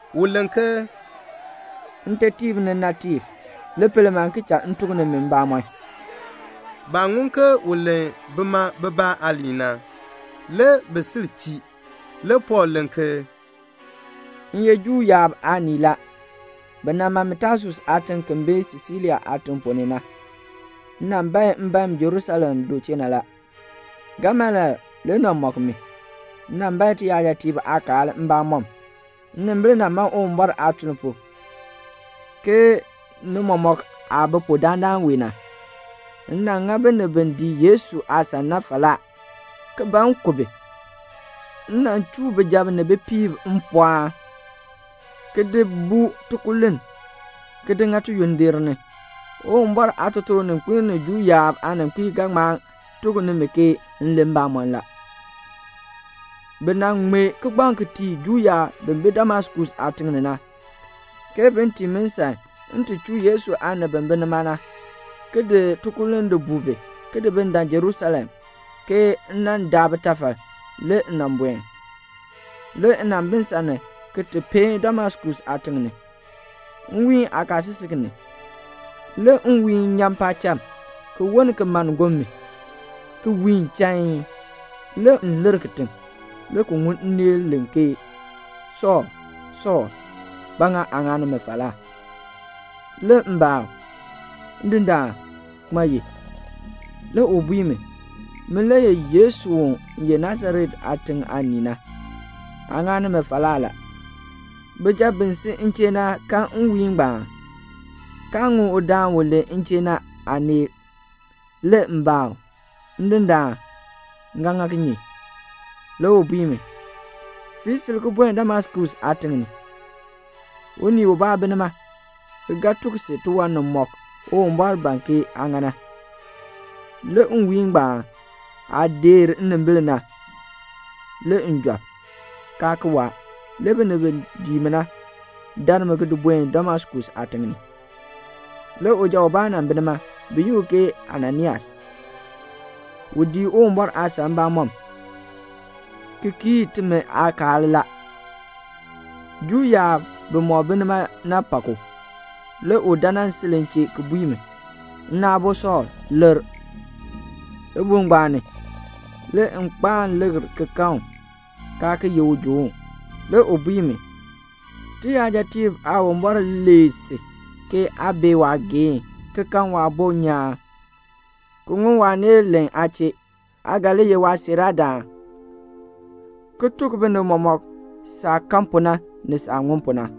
U len ke "Ntetiib ni nnaabitiib, li pel man, ki cha m tuk nimi maabamɔn." Baah ŋun ke u len bima bibaa aaliin na, le bi sil chii. Le Pɔɔl len ke, "M ye Juu yaab aanii la. Bi nan ma mi Tasus aatiŋ ki bi Silisia aatiŋ ponn ni na. M nan bae mbaen Jerusalem du chee na la. Gamaliel le nan mɔk mi. M nan bae tiyajatiib aakaal mbamɔm. Nnimbil nan man Uwumbɔr aatuln pu, ke ni mɔmɔk aah bi pu dandana wee na. M nan ŋa binib bi dii Yesu aasan na falaa, ki ban m ku bi. M nan chuu bijab ni bipiib mpɔɔn, ki di buu tikululn, ki di ŋa tiyondir ni. Uwumbɔr aatotoorninkpil ni Juu yaab aaninkpiib ga ŋma tuk nimi ke m len mbamɔn la. Bi nan ŋmee kigbaŋ ki tii Juu yaab bi bi Damaskus aatiŋ ni na, ke bin tii mi nsan m ti chuu Yesu aanib bi bi nima na, ki di tikululn di buu bi, ki di dan Jerusalem, ke m nan daa bitafal. Le m nan buen." "Le m nan bi nsan ni ki ti peen Damaskus aatiŋ ni. Nwiin kaasisik ni, le nwiihn nyan paacham, ki woln ki mann gonn mi, ki wiin chain. Le m lir kitiŋ, le ki ŋun nneel len ke, 'Sɔɔl, Sɔɔl, ba ŋa aa ŋa mi falaa?' Le m baa u, 'Ndindaan, ŋmaa ye?' Le u bui mi, 'Min le ye Yesu u ye Nasaret aatiŋ aanii na. Aa ŋani mi falaa la.' Bijab bi si m chee na kan nwiihn ngbaan, kaa ŋun udaan u len m chee na aaneel. Le m baa u, 'Ndindaan, m ga ŋa kinye?' Le u bui mi, 'Fii sil ki buen Damaskus aatiŋ ni. Unii ubaa bi nima, ki ga ti tuk si tiwan nimɔk Uwumbɔr ban ke aa ŋa na.' Le nwiihn ngbaan aah deer nnimbil na, le m job, kaa ki waa. Le binib bi dii mi na dar mi di buen Damaskus aatiŋ ni. "Le uja ubaa nan bi nima, bi yi u ke Ananias. U dii Uwumbɔr aasan mbamɔm, ki kii timi aakaal la. Juu yaab bimɔk bi nima na pak u. Le u dan nan sil m chee ki bui mi, 'Nna aabo Sɔɔl, likr.' Libuul ngbaan ni, le m kpaan likr ki kan u, kaa ki ye ujoon. Le u bui mi, 'Tiyajatiib Aawumbɔr lee si, ke aa bee waageehn, ki kan Waabo nyaan, ki ŋun waaneel len aa chee. Aa ga li ye waasiiraadaan, ki tuk binib mɔmɔk saah kan pu na, ni saah ŋun pu na.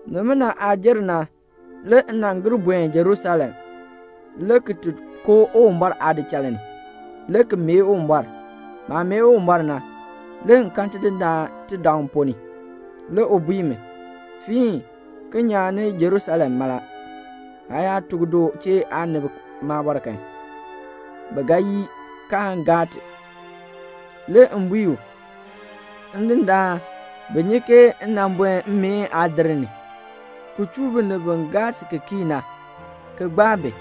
"Nimina aah jer na, le m nan gir buen Jerusalem, le ki ti koo Uwumbɔr aadichal ni, le ki mee Uwumbɔr. Maah mee Uwumbɔr na, le m kan Tidindaan tidaŋ ponn ni. Le u bui mi, 'Fiin, ki nyan ni Jerusalem mala. Aa yaa tuk du chee na aanib maabɔr kan, bi ga yii, kaan gaa ti.' Le m bui u, 'Ndindaan, bi nyi ke m nan buen mmeen aadir ni, ki chuu binib bi gaa si ki kii na, ki gbaa bi.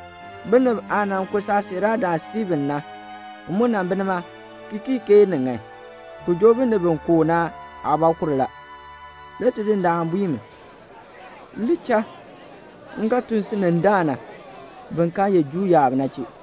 Binib aah nan ku saasiiraadaan Stiifen na, m mu nan bi nima, ki kii ke ni ŋan, ki joo binib bi ku u na aabɔkur la.' Le Tidindaan bui mi, 'Li cha. M ga tun si ni daa na, bin kaa ye Juu yaab na chee."'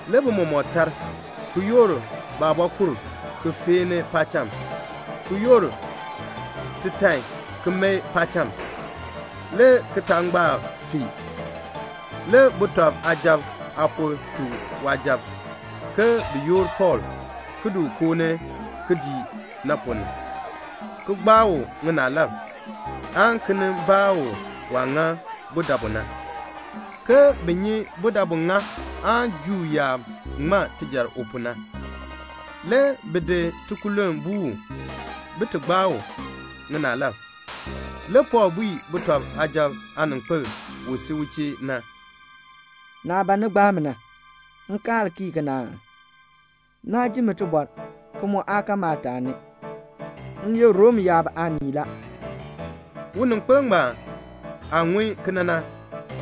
Le bi mɔmɔk tar, ki yoor baabɔkur ki feeni paacham, ki yoor titan ki mae paacham le kitangbaak fee. Le sujatiib aapor tuk waasujatiib ke bin yoor Pɔɔl ki di koo ni kidiik na ponn ni, ki gbaa u ŋinaalab, aan ki nin baa u waah ŋa budabu na, ke bin nyi budabu ŋa aan Juu yaab ŋma tijar u pu na. Le bi di tikululn buu u, bin ti gbaa u ŋinaalab. Le Pɔɔl bui sujatiib aaninkpil u si u chee na, "Naah ban ni gbaa mi na, nkaal na kii kena aa? Naa jin mi tibɔr, ki mu aa kan maataani. M ye Rom yaab aanii la." Uninkpil ngbaan aah ŋun kena na,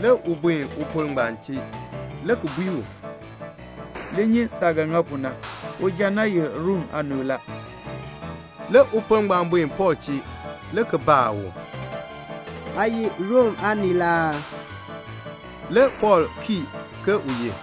le u buen upor ngbaan chee, le ki bui u, "Li nyi saah ga ŋa pu na. Uja na ye Rom aanii la." Le upor ngbaan buen Pɔɔl chee, le ki baa u, "Aa ye Rom aanii la aa?" Le Pɔɔl kii ke u ye.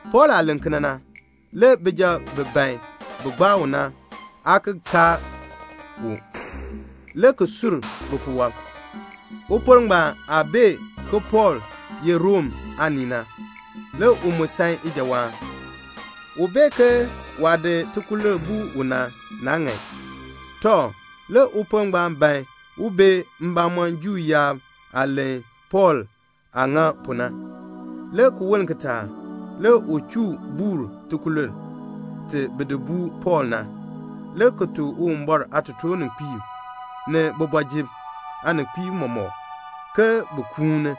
Pɔɔl aah len kena na, le bijab bi ban bin gbaa u na aa ki kaar u, le ki sur bipuwɔb. Upor ngbaan aah bee ke Pɔɔl ye Rom aanii na, le u mu san ijawaan. U bee ke waah di tikululn buu u na, naa ŋan. Tɔ, le upor ngbaan ban un bee mbamɔm Juu yaab aah len Pɔɔl aah ŋa pu na. Le ki woln kitaak, le u chuu buur tikululn ti bi di buu Pɔɔl na, le ki tuk Uwumbɔr aatotoorninkpiib, ni kooti ni aaninkpiib mɔmɔk ke bin kuuni,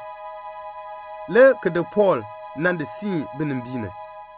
le ki di Pɔɔl nan di siin binimbiin ni.